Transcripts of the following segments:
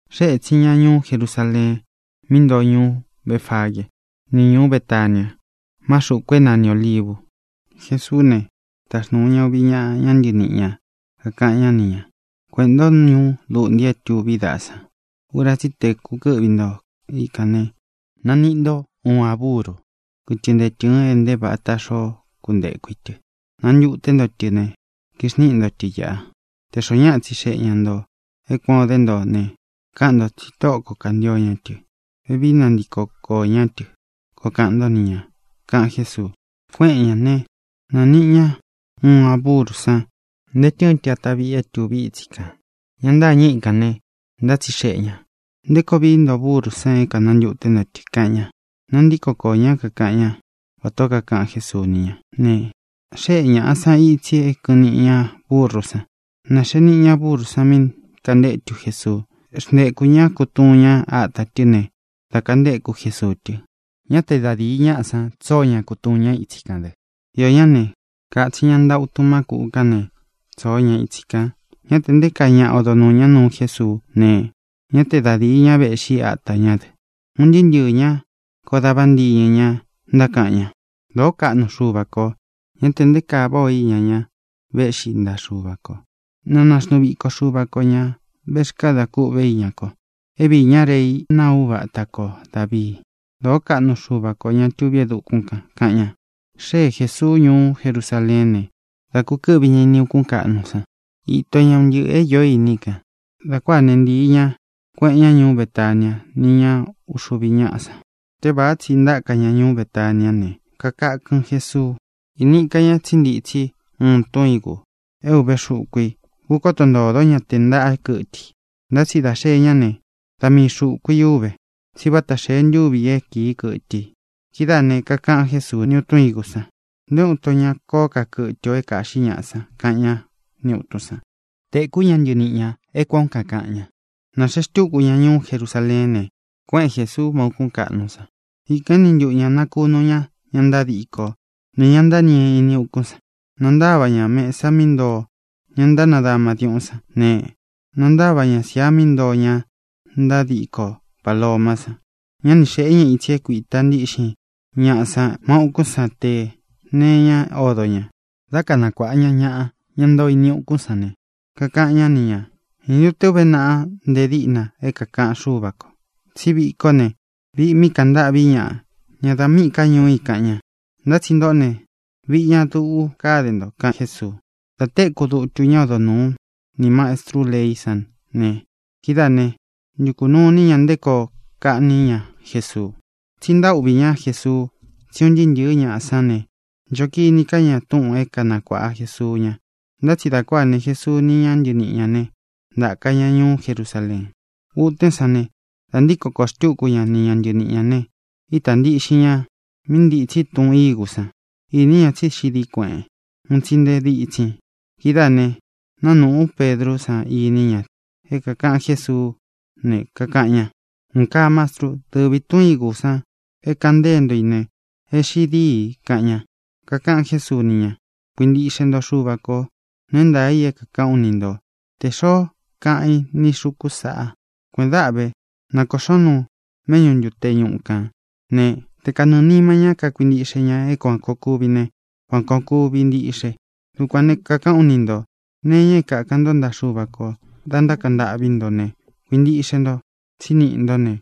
Xée ētsin ña ñuú Jerusaleen, mí ntoo ñuú Befagee ni ñuú Betania má xūku é nani Ōlivu. Jesuú ne, taxnūu ña uvi ñaꞌa ñá ntɨniꞌi ñā, kakaꞌan ñá ni ñā: —Kueꞌēn ntó ñuú luꞌnti é tuví daꞌa san. Ura tsí i te kūkɨ́ꞌvi nto ikān ne, naniꞌi nto uun a búru kɨtɨ ntee tɨ́ɨn é ntē vata xoó kunteku í tɨ. Nantuté nto tɨ ne, kixníꞌi nto tɨ īꞌa. Tē xoó ñaꞌa tsixeꞌe ña ntō é kuān ó de nto ne, káꞌan ntō tsi Tóꞌo ko kāntio ña tɨ; vevií nantiko koō ñá tɨ, koo kaꞌan ntó ni ñā —kaꞌan Jésuu. Kuéꞌen ñā né, nāniꞌi ña uun a búru san, ntee tɨ́ɨn tɨ atá viꞌi é tuví itsi kān. Ña ntâñɨ́ ikān ne, ntátsixeꞌe ñā: —¿Nté koo vií nto burú san é kānantuté nto tɨ? —kaꞌan ña. Nantíko koō ñá, kakaꞌan ñá vatā ó kakaꞌan Jésuu ni ñá ne, xéꞌe ñāꞌa san itsi é kɨ̄ꞌɨn niꞌi ña búrú san. Nāxee niꞌi ña búrú san mí kāntétu Jesuu. Xntekū ñá kutuun ña áta tɨ́ ne, dā kantéku Jesuu tɨ. Ñá te da dīi ñaꞌá san tsóo ña kutuun ñá itsi kān dɨ. Iō ñá ne, kātsin ña nta utun má kūꞌu kán ne, tsoo ña itsi kān. Ñá tē nté kaa ñaꞌa odo nuū ñá nuu Jésuú ne, ñá te da dīi ña véꞌxi ata ñá dɨ. Un ntɨɨ́ ntɨɨ̄ ña koó dā vantiñɨ ña ntákaꞌan ña: —¡Dōó kaꞌnu Xuva kō! ¡Ñá tē nté kaa váꞌā o iña ñá véꞌxi ntaꞌa Xuva kō! ¡Na naxnuu viko Xuva kō ña vexkádā kûꞌvé iña ko, é viī ñá Rei naa úvata ko Dāvii! ¡Dōó kaꞌnu Xuva kō, ña tuví e dukún kān! —kaꞌan ña. Xée Jēsuu ñuú Jerusaleén ne, dá kūkɨ́ꞌvi ña ini ukún kaꞌnu san. Ito ña un ntɨꞌɨ̄ é īó iní i kān. Dā kuáā né, ntīi ña, kueꞌen ña ñuú Betania ni ña uxuvi ñáꞌa san. Tévāá tsi ntáka ña ñuú Betaniá ne, kakakɨn Jesuu. Īni ika ña tsí ntitsi uun tun ígū é ūve xuku i. Kūkóto ntōdó ña tē ntaꞌá kɨtɨ i. Ntá tsi dā xee ñá ne, da mii xūku í uve, tsí vata xee ntúvī é kīi kɨtɨ i. Kidáā né, kakaꞌan Jésuu ni tun ígū san: —Nté uun ito ña koó ka kɨtɨ o é kāꞌxí ñaꞌa san —kaꞌan ñá ni ūtun san. Tēkú ña ntɨniꞌi ñā é kuān ó kakaꞌan ña. Nāxee xtúku ña ñuú Jerusaleén ne, kuéꞌen Jēsuu má ūkún kaꞌnu san. Ikān éni ntuꞌu ñā nakunu ña ña ntádiko ni ñā ntáñii ini ukún san. Nantáva ña mesa mí ntoo ña ntánadama diuꞌún san ne, nantáva ña sia mí ntoo ña ntádiko palomá san. Ñá ni xēꞌé ña itsi é kuīta ntíꞌxin ñaꞌa san má ūkún san tē nee iñá odo ñā. Dá kanakuāꞌa ña ñaꞌa, ña ntoo ini ukún san ne, kakaꞌan ñá ni ñā: —¿Ñā ntu te uve náꞌa nte díꞌna é kākaꞌan Xúva kō: “Tsí viꞌi kó ne, viꞌi mí kaꞌan ntâꞌví ñaꞌa, ña dā míꞌī ká ñuu i”, kaꞌan ña? Ntá tsi ntōꞌó ne, viꞌi ña dūꞌu káde nto —kaꞌan Jésuu. Dā téku dutu ñá odo nūú nī mastrú leí san ne, kidáā né, ntukū nuu iní ña nté koo kaꞌní ña Jesuu. Tsí ntaúꞌvī ñá Jesuu, tsí un ntɨɨ́ ntɨ̄ɨ́ ñaꞌa sán ne, ncho kini ká ña túꞌūn é kanakuāꞌa Jesuu ña. Ntá tsi dā kuáa ne, Jesuu ni ña ntɨníꞌi ñā né, ntāka ña ñuú Jerusaleen. Utén san ne, dā ntíko kōo xtúku ña ni ña ntɨniꞌi ñā ne, ítā ntiꞌxin ña mí ntitsi tun ígū san. Īní ña tsí xiꞌi dií kueꞌen, un tsi nte dítsin i. Kidáā ne, nánūꞌú Pedrú san iní ña é kākaꞌan Jésuú ne, kakaꞌan ña: —Un kaa, Mastru. Dɨvī tun ígū san é kāꞌan ntée nto i ne, e xiꞌi dîi —kaꞌan ña. Kakaꞌan Jésuu ni ña: —Kuintiꞌxe nto Xuva kō. Nuu é ntaā i é kākaꞌán u ni nto: tē xoó kaꞌan í ni xūku sáꞌā: “Kuēꞌen dáꞌan vé, na kōꞌxón nuun méꞌñu ntute ñuꞌu kān”, né, te kanɨɨ̄ nima ñá kakuintiꞌxe ña é kuān koo kuvi ne, kuān koo kuvi ntiꞌxe. Dukuān ne, kakaꞌán u ni ntō: nee iña é kākan ntó ntaꞌa Xuva kō da ntákaꞌan ntâꞌví nto ne, kuintiꞌxe nto tsí niꞌi ntó ne,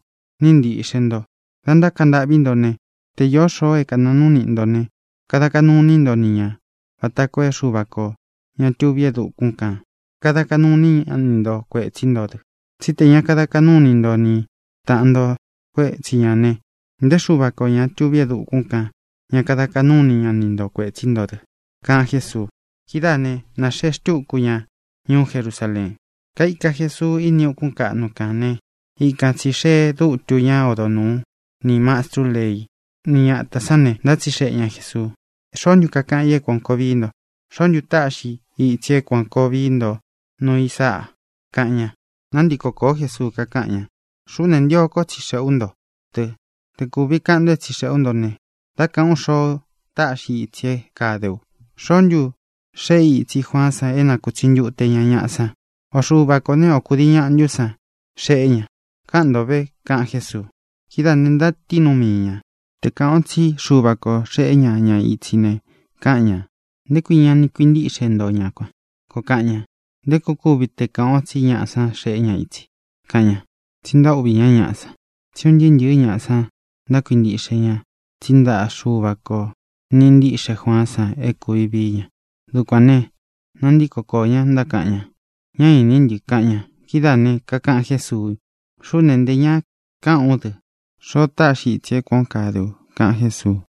níꞌi ntīꞌxe nto. Dā ntákaꞌan ntâꞌví nto ne, te īó xoo é kanāa núu niꞌi ntō ne, kada kaꞌnu iní nto ni ñā vata koo é Xuva kō, ñá tuví e dukún kān, kada kaꞌnu iní ña ni nto kuētsí nto dɨ. Tsí tē ña kada kaꞌnú ini nto ni tāꞌan nto kuétsi ñā ne, nté Xuva kō, ña tuví e dukún kān, ña kada kaꞌnú ini ña ni nto kuētsí nto dɨ —kaꞌan Jésuu. Kidáā né, nāxee xtúku ña ñuú Jerusaleen. Kaika Jesuu ini ukún kaꞌnu kān né, ikan tsī xee dútu ñá odo nūú nī mastrú leí ni ñatā sán ne, ntátsixeꞌe ña Jēsuu: —¿Xoó ntu kakaꞌan i é kuān koo vií nto? ¿Xoó ntu táꞌxi i itsi é kuān koo vii nto nuu i sáꞌa? —kaꞌan ña. Nantíko kōó Jesuu, kakáꞌan ña: —Xuꞌú ne, ntio kó tsixeꞌē ú nto dɨ. Te kūvi kaꞌan nto é tsixeꞌē ú nto ne, dá kāꞌán u xoo táꞌxi i itsi é kade u. ¿Xoó ntu xeꞌé i itsi Juaán san é nakūtsi ntute ña ñaꞌa san? ¿O Xuva kō né, o kūdii ñaꞌa ntú san xeꞌé ña? Káꞌan nto vē —kaꞌan Jésuu. Kidáā ne, ntatíin nuu mii ñā: —Te kāꞌan o tsí Xuva kō xeꞌé ña ña itsi ne, káꞌan ñā: “¿Nté kui ña ni kuintíꞌxe nto ña kuan?” koo kaꞌan ña. ¿Nté koo kuvi te kāꞌan o tsí ñaꞌa san xeꞌé ña ña itsi? —kaꞌan ña. Tsi ntaúꞌvī ñá ñaꞌa san, tsí un ntɨɨ́ ntɨ̄ɨ́ ñaꞌa san ntákuintiꞌxe ña tsí ntaꞌa Xuva kō niꞌi ntíꞌxe Juaán san é kūvi vií ña. Dukuān ne, nantíko koō ñá, ntákaꞌan ña: —Ñá īní ntɨ —kaꞌan ña. Kidáā ne, kakaꞌan Jésuu: —Xuꞌú ne, ntē ñá kaꞌán u dɨ xoo táꞌxi i itsi é kuān ó kade u —kaꞌan Jésuu.